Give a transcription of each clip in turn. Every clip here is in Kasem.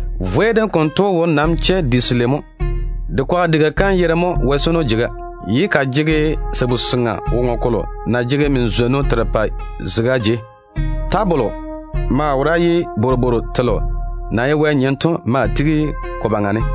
Wɛ wara-vwei dem konto wo nam pɔɔre di selei mo. De kwaga diga kam yere mo ‘Wɛ di-yuu kom’, ye ka jege min-zwon-zego kom. min-zwon-zego kom = sabu-seŋa woŋo kolo na jege min-zwonnu terepɛ zega jei to. Tabolo de maa wora ye bworobwooru telo na ye Wɛ nyem to maa tigi ko baŋa ne.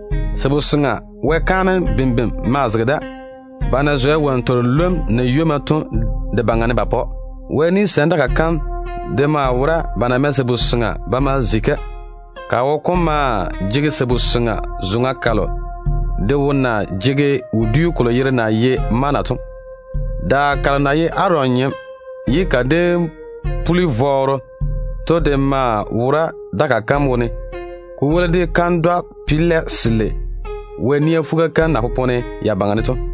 Sabu-seŋa Wɛ kaanem dakaa maa zege da, ba na zwɛ wonnu telo lwom na ywomma to ka baŋa ne ba pa‑o. Wɛ ni-gwonim dakaa kam de maa wora ba na mɛ sabu-seŋa ba ma kwoli-ka. Ka wo kom maa jege sabu-seŋa zoŋa kalo de wo na jege wodiu kolo yere na ye ‘Manna’ to. Nacheiga kalo na ye Aron nyem ye ka déem puli vɔɔro to de maa wora Wɛ ni-gwonim dakaa kam wone, ko woli de kandwa-pelɛ selei Wɛ nia fuga kam na popone se baŋa ne to.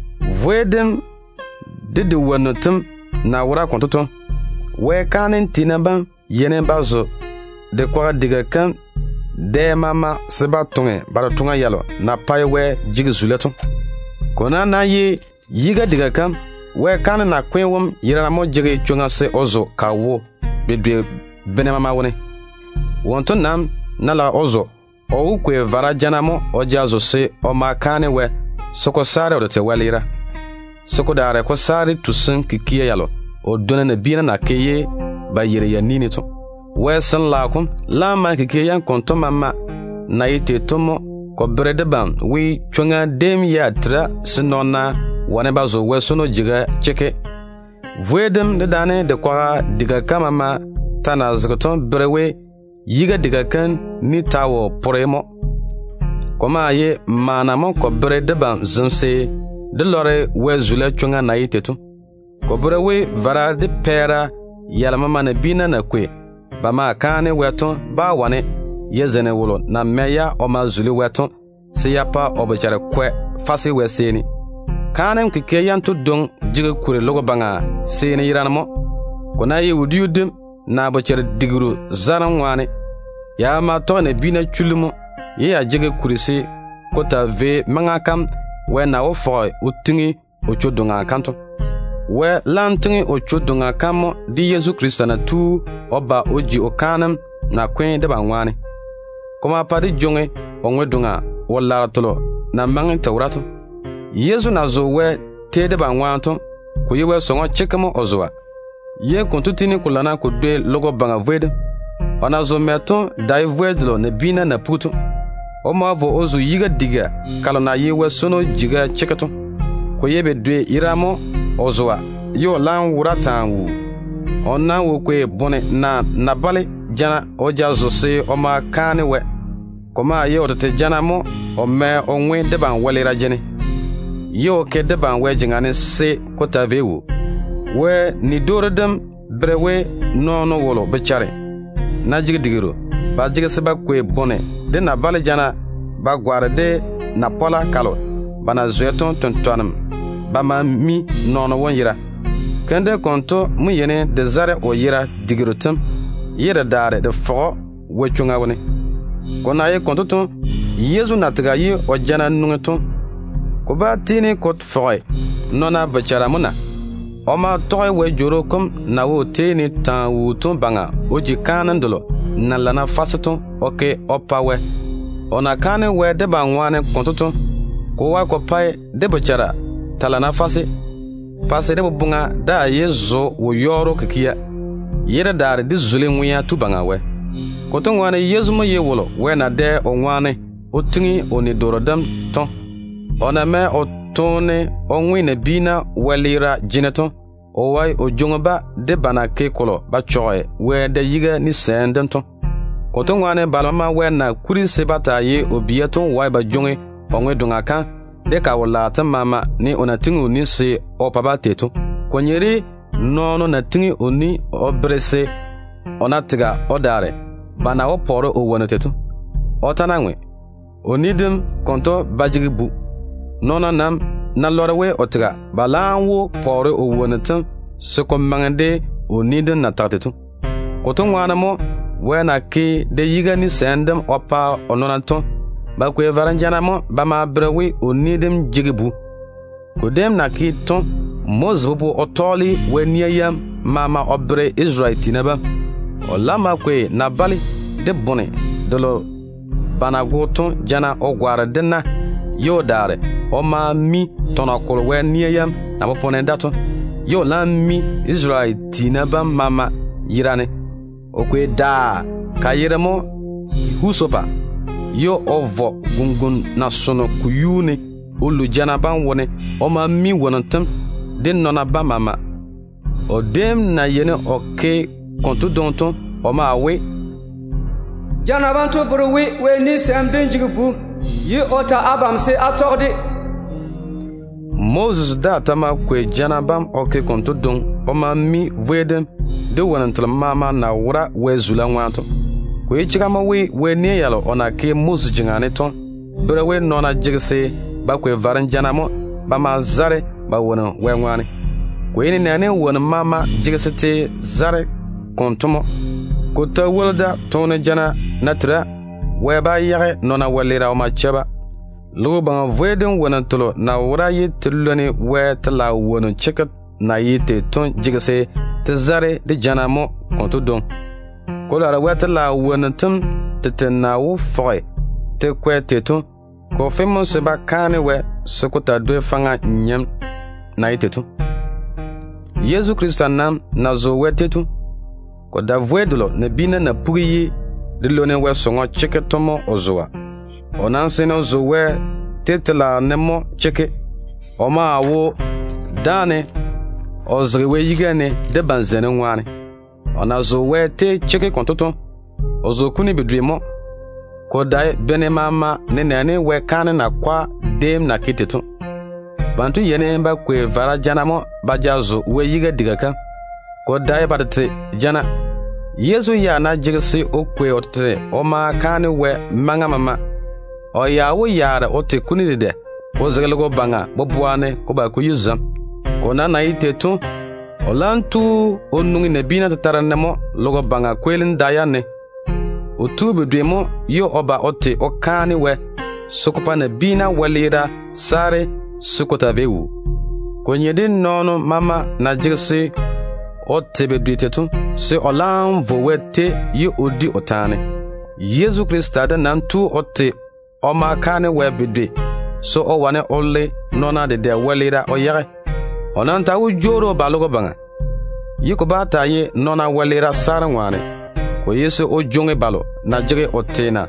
Wara-vwei dem de de wonnu tem na wora konto to, Wɛ kaanem tiina bam yeini ba zo de kwaga diga kam dɛ maama mo se ba toŋe ba totoŋa yalo na pae Wɛ jege zula to. Ko nam ná ye di-yun-gala kam, Wɛ kaanem nakwe tu wom yerane mo jege chwoŋa se o zo ka wo bedwe bene maama wone. Wonto nam ná lage o zo, o wó kwei vara jana mo o ja zo se o ma kaane Wɛ, se ko saare o tete wɛleera, se ko daare ko saare tusim kikia yalo o dwonna nabiina na ke ye ba yeiri ya ni ne to. Wɛ Sin-laao kom laam mae kikia yam konto maama na ye tei to mo ko bere debam we, chwoŋa déem ya tera se nɔɔna wane ba zo Wɛ di-yun-gala kam. Vwei dem dedaane de kwaga diga kam maama ta na zege to bere we di-yun-gala kam ni ta wo pore mo. Ko maa ye maana mo ko bere debam zem se dé lɔre Wɛ chwoŋa tɔgem na ye tei to. Ko bere we vara de pɛɛra yalo maama nabiina na kwei ba ma kaane Wɛ to bá wane ya zeini wolo na kwei-ya o ma zuli Wɛ to se ya pa o bochare kwɛ fase Wɛ seeni. Kaanem kikia yanto dwoŋi jege kuri logo baŋa seeni yerane mo, ko ná ye wodiu dim, naa bochare digiru zarem ŋwaane. Ya maama tɔge nabiina chullu mo, ye ya jege kuri se ko taa vei maŋa kam Wɛ na wó fɔge o tiŋi o chwo-doŋa kam to. Wɛ laam tiŋi o chwo-doŋa kam mo de Yezu Krista na tu o ba o ji o kaanem nakwe tu debam ŋwaane to. Ko ma pa dé jwoŋi o ŋwe-doŋa wo-laaro telo na maŋe te wora to. Yezu na zo Wɛ tei debam ŋwaane to, ko ye Wɛ sɔŋɔ chekke mo o zoa, ye konto tiini ko lana ko dwoi logo baŋa vwei dem. O na zo mɛ to dae vwei delo nabiina na pugi to. O ma vo o zo Wɛ tete di-yun-gala kam. Ko ye bedwe yerane mo o zoa, ye o laam wora taa wuu. O nam wo kwei bone naa na-bale jana o ja zo se o ma kaane Wɛ. Ko maa ye o tete jana mo o mɛ o ŋwe debam wɛleera jene, ye o jwoŋi debam o ke Wɛ jeŋa ne se ko taa vei wuu. Wɛ ni-dwoori dem bere we, nɔɔno wolo bochare ná jege digiru, ba jege se ba kwei bone jana naa na-bale jana ba gwaane de na-chwɛ delo ba na zwɛ to tentwarem mo ba ma mi nɔɔno wom yera. Keim dem konto mo yeini de zare o yera digiru tem ye de daare de fɔge‑o Wɛ chwoŋa wone. Ko na ye konto to, Yezu na tega ye o jana nwoŋi to, ko bá tiini ko fɔge nɔɔna bochara mo na? O ma tɔge Wɛ Jworo kom na wo o tei ne taa wuu to baŋa o ji kaanem delo na lana fase to o ke o pa Wɛ. O na kaane Wɛ debam ŋwaane konto to, ko wae ko pae dé bochara taa lana fase, pa se dé boboŋa daa yé zo wo-yɔɔro kikia, wo-yɔɔro kikia naa kikia yalo na pae toone to ye dé daare dé zuli Ŋwea Tu Baŋa Wɛ. Konto ŋwaane Yezu mo ye wolo Wɛ na dɛ o ŋwaane o gwoni ni-doore de o nɔɔna bam to. O na mɛ o toone o ŋwe nabiina wɛleera jene to, o wae o jwoŋi-ba de ba na ke kolo ba chɔge Wɛ da-yiga ni-gwonim dem to. Konto ŋwaane balo maama Wɛ na kuri se ba taa ye o bia to wae ba jwoŋi o ŋwe-doŋa kam de ka wo-laaro tem maama, ne o na pwooli se o pa-ba tei to. Ko nye de nɔɔno na gwoni o ni o bere se, o ná tega o daare, ba na wó pɔɔre o wonnu tei to. O ta ná ŋwe, o ni dem konto ba jege bu. Nɔɔna nam ná lɔre we o tega, ba laam wó pɔɔre o wonnu tem se ko maŋe de o ni dem na tage tei to. Konto ŋwaane mo, Wɛ na ke da-yiga ni-gwonim dem o pa o nɔɔna to, ba kwei varem jana mo ba ma bere we, o ni dem jege bu. Ko déem na ke to, Moses bobo o tɔɔle Wɛ nia yam maama o bere Isarele tiina bam maama. O laam ma kwei na-bale de bone delo ba na go to jana o gwaane de na, ye o daare o ma o mi tɔnɔ kolo Wɛ nia yam na popone da to. O laam ma mi Isarele tiina bam maama yera ne. O kwei Husopa tio daa, ye o vɔ gare-ŋon-seŋa ka yuu ne o lu jana bam wone o ma mi wonnu tem, de nɔɔna bam maama. O déem na yeini o ke konto dwoŋi to mo o tage we, “Jana banto bere we Wɛ ni-gwonim dem jege bu, o na tage abam se á tɔge-de to.” Moses daa ta ma kwei jana bam o ke konto dwoŋi o ma mi vwei dem de wonnu telo maama na wora Wɛ zula ŋwaane to. Ko ye chega mo we, Wɛ nia yalo o na ke Moses jeŋa ne to bere we nɔɔna jege se ba kwei varem jana mo ba ma zare ba wonnu Wɛ ŋwaane. Ko ye nenɛɛne wonnu maama jege se te zare konto mo. Ko ta woli da, toone jana ná tera, Wɛ bá yage nɔɔna wɛleera o ma chɛ-ba. Logo baŋa vwei dem wonnu telo na wora ye te lwoni Wɛ telaao wonnu chekke na ye tei to jege se te zare de vara jana mo konto dwoŋi. Ko daare Wɛ telaao wonnu tem tete na wó fɔge te kwɛ tei to, ko fe mo se ba kaane Wɛ se ko taa dwoi faŋa kaanem dem na ye tei to. Yezu Krista nam na zo Wɛ tei to, ko dae wara-vwei delo nabiina na pugi ye de lwoni Wɛ sɔŋɔ chekke to mo o zoa. O nam seene o zo Wɛ tei telaao ne mo chekke. O maa wo dáane o zege Wɛ yiga ne debam zeinim ŋwaane. O na zo Wɛ tei chekke konto to, o zo kuni bedwe mo, ko dae bene maama wone, nenɛɛne Wɛ kaanem yiga tiina déem na ke tei to. Banto yeini ba kwei vara jana mo ba ja zo Wɛ di-yun-gala kam, ko dae ba tete jana. Yezu ya ná jege se o kwei o tete o ma kaane Wɛ bene maama wone, o ya wó yaare o te kuni dedɛ, ko zege logo baŋa boboa ne ko ba ko yi zem. Ko nam na ye tei to, o laam tu o veere o tete nabiina tetare ne mo logo baŋa kweelim da yam ne. O tu bedwe mo ye o ba o te o kaane Wɛ se ko pa nabiina wɛleera saare se ko taa vei wuu. Ko nye de nɔɔno maama na jege se o te bedwe tei to, se o laam vo Wɛ tei ye o di o taane. Yezu Krista de nam tu o te o ma kaane Wɛ bedwe mo, se o wane o le nɔɔna dedɛ wɛleera o yage. O nam ta wó jwoori o ba logo baŋa, ye ko bá taa ye nɔɔna wɛleera saarem ŋwaane. Ko ye se o jwoŋi balo na jege o teena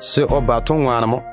se o ba to o yage mo.